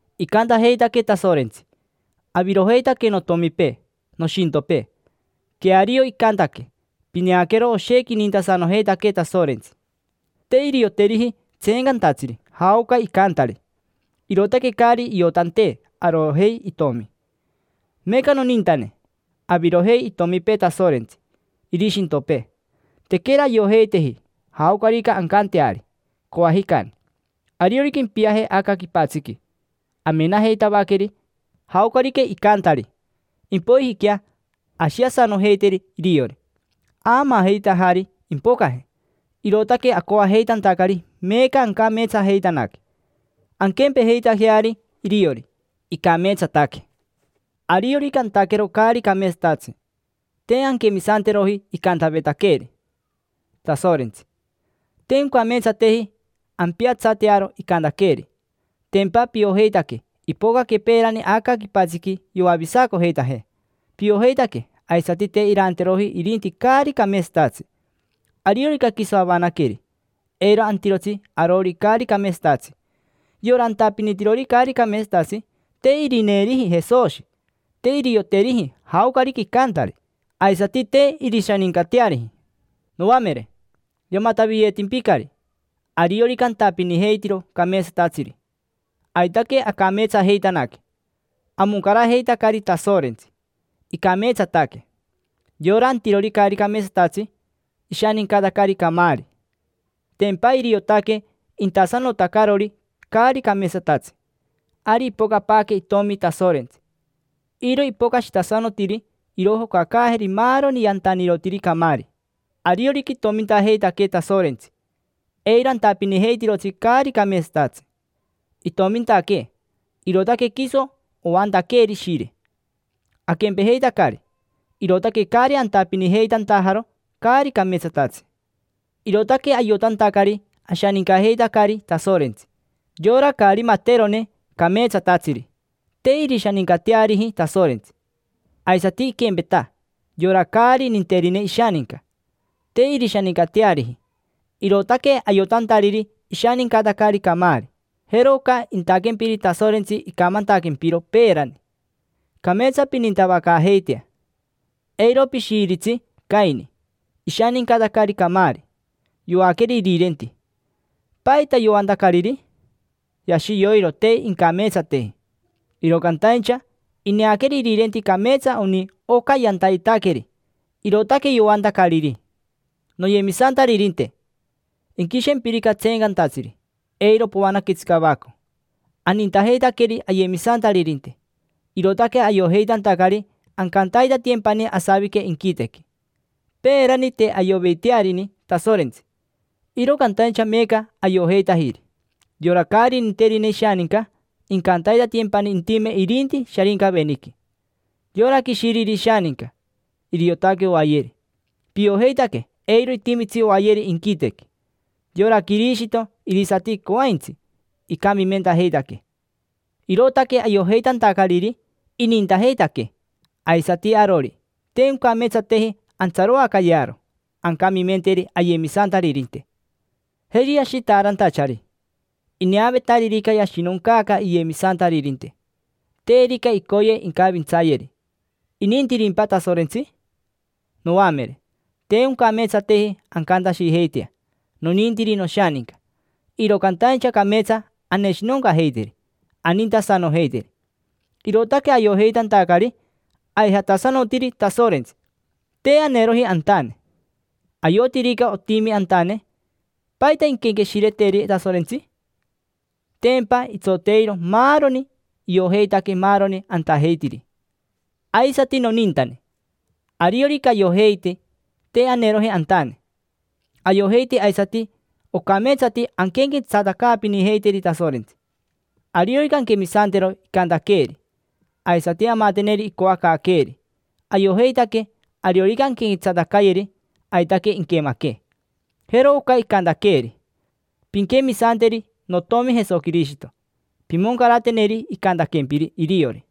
Icantajeitaquee Tasorentsi: “Avirojeitaque notomipee, nishintopee”. Queario icantaque. Pineaquero, oshequi inintasanojeitaquee Tasorentsi. Te irioteriji tseencantatsiri jaoca icantari, irootaque caari iotantee arojei itomi. Meeca, nonintane, avirojei itomipee Tasorentsi, irishintopee. Tequera ayojeiteji jaocarica ancanteari, coajicani. Ariorica impiaje aca quipatsiqui, amenajeitavaqueri jaocarica icantari. Impoijiquea ashiasanojeiteri iriori. Aamaajeitajari impocaje, irootaque acoajeitantacari meeca ancameetsajeitanaque: anquempejeitajeari iriori, icameetsataque. Ariorica antaquero caari cameetsatatsi, te anquemisanteroji icantavetaqueeri Tasorentsi. Te oncameetsateji ampiatsatearo icantaqueeri. Tempa piojeitaque ipocaque peerani aca quipatsiqui yoavisacojeitajee. Piojeitaque aisati te iranteroji irinti caari cameetsatatsi. Ariorica quiso avanaqueri, eiro antirotsi arori caari cameetsatatsi. Yora antapinitirori caari cameetsatatsi te irineeriji Jesoshi, te irioteriji jaocarica icantari, aisati te irishanincateariji. Noamere, yamataviyeetimpicari. Ariorica antapinijeitiro cameetsatatsiri, aitaque acameetsajeitanaque: amoncarajeitacari Tasorentsi, icameetsataque. Yora antirori caari cameetsatatsi, ishanincatacari camaari: tempa iriotaque intasanotacarori caari cameetsatatsi. Ari ipocapaaque Itomi Tasorentsi. Iro ipocashitasanotiri irojocacaajeri maaroni yantanirotiri camaari. Ariorica itomintajeitaquee Tasorentsi, eiro antapinijeitirotsi caari cameetsatatsi. Itomintaquee, irootaque quiso oantaqueeri Ishire, aquempejeitacari. Irootaque caari antapinijeitantajaro caari cameetsatatsi. Irootaque ayotantacari ashanincajeitacari Tasorentsi. Yora caari materone cameetsatatsiri, te irishanincateariji Tasorentsi. Aisati iquempeta yora caari ninterine ishaninca, te irishanincateariji, irootaque ayotantariri ishanincatacari camaari. Jero oca intaquempiri Tasorentsi icamantaquempiro peerani: “Cameetsa pinintavacaajeitea”. Eiro pishiiritsi Caini: ishanincatacari camaari. Yoaqueri irirenti. ¿Paita yoantacariri? Yashi yoiro te incameetsateji, iro cantaincha ineaqueri irirenti cameetsa oni oca yantayetaqueri, irootaque yoantacariri. Noyemisantaririnte, inquishempirica tseencantatsiri, eiro poanaquetsi cavaco. Anintajeitaqueri ayemisantaririnte, irootaque ayojeitantacari ancantaitatiyempani asavique inquitequi. Peerani te ayoveitearini Tasorentsi, iro cantaincha meeca ayojeitajiri. Yora caari ninterine ishaninca, incantaitatiyempani intime irinti Sharincaveniqui. Yora quishiriri ishaninca, iriotaque oayeri. Piojeitaque eiro itimitsi oayeri inquitequi. Yora Quirishito irisati coaintsi icamimentajeitaquee, irootaque ayojeitantacariri inintajeitaquee. Aisati arori, te oncameetsateji antsaroacayearo ancamimenteri ayemisantaririnte. Jeri ashitaarantachari: ineavetaririca yashinoncaaca iyemisantaririnte, terica icoye incavintsayeri, ¿inintirimpa Tasorentsi? Noamere, te oncameetsateji ancantashijeitea: “Nonintiri noshaninca”. Iro cantaincha cameetsa aneshinoncajeiteri, anintasanojeiteri, irootaque ayojeitantacari aijatasanotiri Tasorentsi, te aneroji antane. Ayotirica otimi antane, ¿paita inquenqueshireteri Tasorentsi? Tempa itsoteiro maaroni, iojeitaque maaroni antajeitiri. Aisati, nonintane, ariorica ayojeite te aneroji antane, ayojeite aisati ocameetsati anquenquetsatacaapinijeiteri Tasorentsi. Ariorica anquemisantero icantaqueeri, aisati amateneri icoacaaqueeri, ayojeitaque ariorica anquenquetsatacayeri, aitaque inquemaquee. Jero oca icantaqueeri: “Pinquemisanteri notomi Jesoquirishito. Pimoncarateneri icantaquempiri iriori: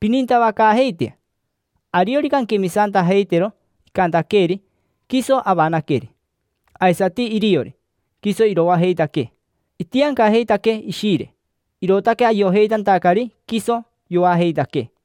‘Pinintavacaajeitea’”. Ariorica anquemisantajeitero icantaqueeri, quiso avanaqueri. Aisati iriori, quiso iroajeitaquee. Itiancajeitaquee Ishire, irootaque ayojeitantacari quiso yoajeitaquee.